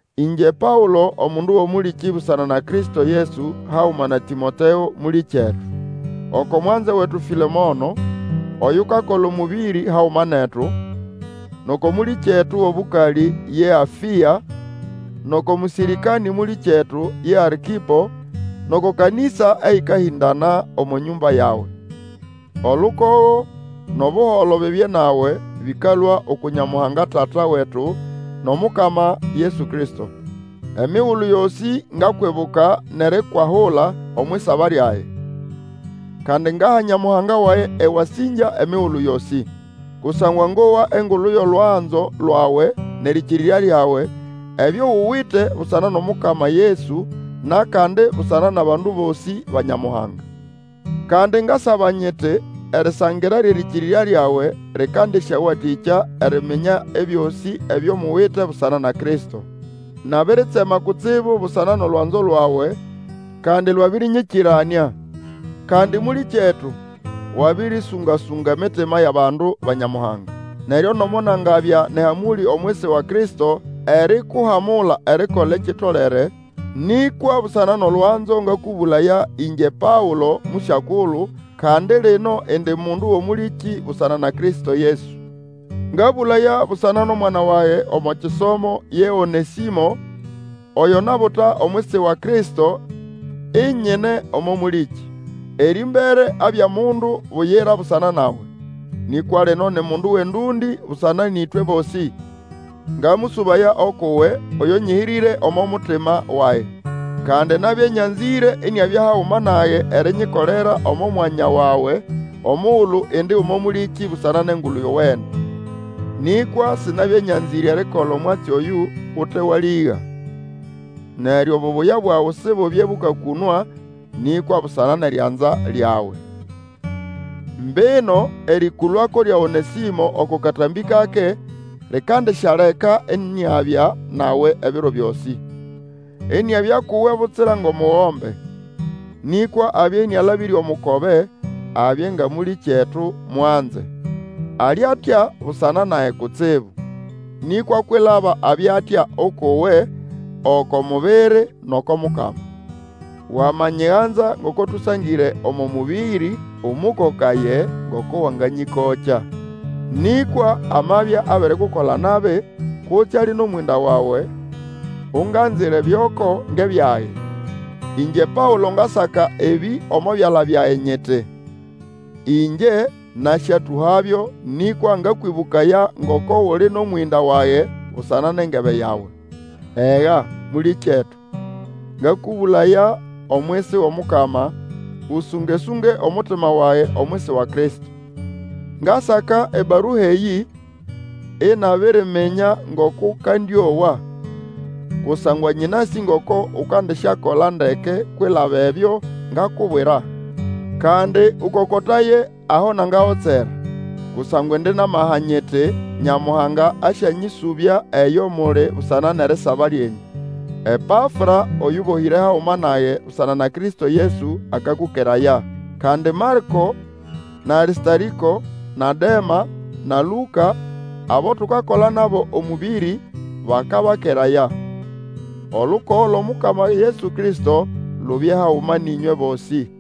Ĩngye Paũlo, omundu wʼomũlĩkĩ busana na Kristo Yesu, haguma na Tĩmoteo mũlĩkyetu. Oko mwanze wetu Fĩlemono, oyukakola omũbĩrĩ haguma netu, Nʼoko mũlĩkyetu wʼobũkalĩ, ye Afĩa, nʼoko mũsĩrĩkanĩ mũlĩkyetu ye Arkipo, nʼoko kanĩsa eyĩkahĩndana omo nyũmba yawe. Olukogo, nʼobuholo bibye nawe, bĩkalũa uku Nyamuhanga, Tata wetu, nʼOmukama Yesu Kristo. Emigulu yosĩ ngakwibuka nʼerikwahula omwʼisaba lyage, kandi ngaha Nyamuhanga wage ewasĩngya emigulu yosĩ. Kusangwa ngowa engulu yʼolwanzo lwawe, nʼerĩkĩrĩrya lyawe, ebyo uwite busana nʼOmukama Yesu, nʼakandi busana nʼabandu bosĩ ba Nyamuhanga. Kandi ngasaba nyiti, erisangira lyʼerĩkĩrĩrya lyawe lĩkandĩsyawatĩkya eriminya ebyosĩ ebyo muwite busana na Kristo. Nabiritsema kutsibu busana nʼolwanzo lwawe, kandi lwabĩrĩnyĩkĩranĩa. Kandi mũlĩkyetu, wabĩrĩsũnga-sũnga emitima yʼabandu ba Nyamuhanga. Neryo nomo nangabya nʼehamũlĩ omwisi wa Kristo erikuhamula erikola ekitolere, nĩkwa busana nʼolwanzo, ngakũbũlaya, ĩngye Paũlo mũsyakulu, kandi lino indi mundu wʼomũlĩkĩ busana na Kristo Yesu. Ngabũlaya busana nʼomwana wage omo kisomo, ye Onesĩmo, oyo nabuta omwisi wa Kristo, inyine omo mũlĩkĩ. Erĩmbere abya mundu buyira busana nawe, nĩkwa lino ni mundu wʼendũndĩ busana nʼĩtwe bosĩ. Ngamũsũbaya ukʼuwe, oyo nyĩhĩrĩre oko mutima wage. Kandi nabya nyanzĩre iniabya haguma nage erinyikolera omo mwanya wawe omugulu indi omo mũlĩkĩ busana nʼEngulu Yowene. Nĩkwa sinabya nyanzĩre erikola omwatsi oyũ ute walĩga, neryo obubuya bwawe sibubye bũkakũnwa, nĩkwa busana nʼerianza lyawe. Mbino erĩkũlũako lya Onesĩmo oko katambĩ kake likandisyaleka iniabya nawe ebiro byosĩ. Iniabya kuwe butsira ngʼomukobe. Nĩkwa abye ĩnĩalabĩre omukobe, abye nga mũlĩkyetu mwanze. Ali atya busana nage kutsibu, nĩkwa kwilaba abya atya ukʼuwe, oko mubiri, nʼoko Mukama. Wamanyiganza ngoko tũsangĩre omo mũbĩrĩ, ũmũkokaye ngoko wanganyĩkokya. Nĩkwa amabya abirikukola nabi, kutse ali mʼomwĩnda wawe, unganzire byʼoko ngʼebyage. Ĩngye Paũlo ngasaka ebĩ omo byala byage nyiti, Ingye nasyatũhabyo nĩkwa ngakwĩbũkaya ngoko uli nʼomwĩnda wage busana nʼengebe yawe. Ega, mũlĩkyetu, ngakũbũlaya omwisi wʼOmukama, ũsũngasũnge omutima wage omwisi wa Kristo. Ngasaka ebarua eyĩ inabiriminya ngoko ũkandĩowa, kusangwa nyĩnasĩ ngoko Ukandisyakola ndeke kwilaba ebyo ngakubwira. Kandi Ũkokotaye aho nangagotsera; kusangwa indi nʼamaha nyiti, Nyamuhanga asyanyĩsũbya eyo muli busana nʼerisaba lyenyũ. Epafra, oyũbohĩre haguma nage, busana na Kristo Yesu, akakũkeraya. Kandi Marĩko, na Arĩstarĩko, na Dema, na Lũka, abo tukakola nabo omũbĩrĩ, bakabakeraya. Olukogo lwʼOmukama Yesu Kristo, lubye haguma nʼĩnywe bosĩ.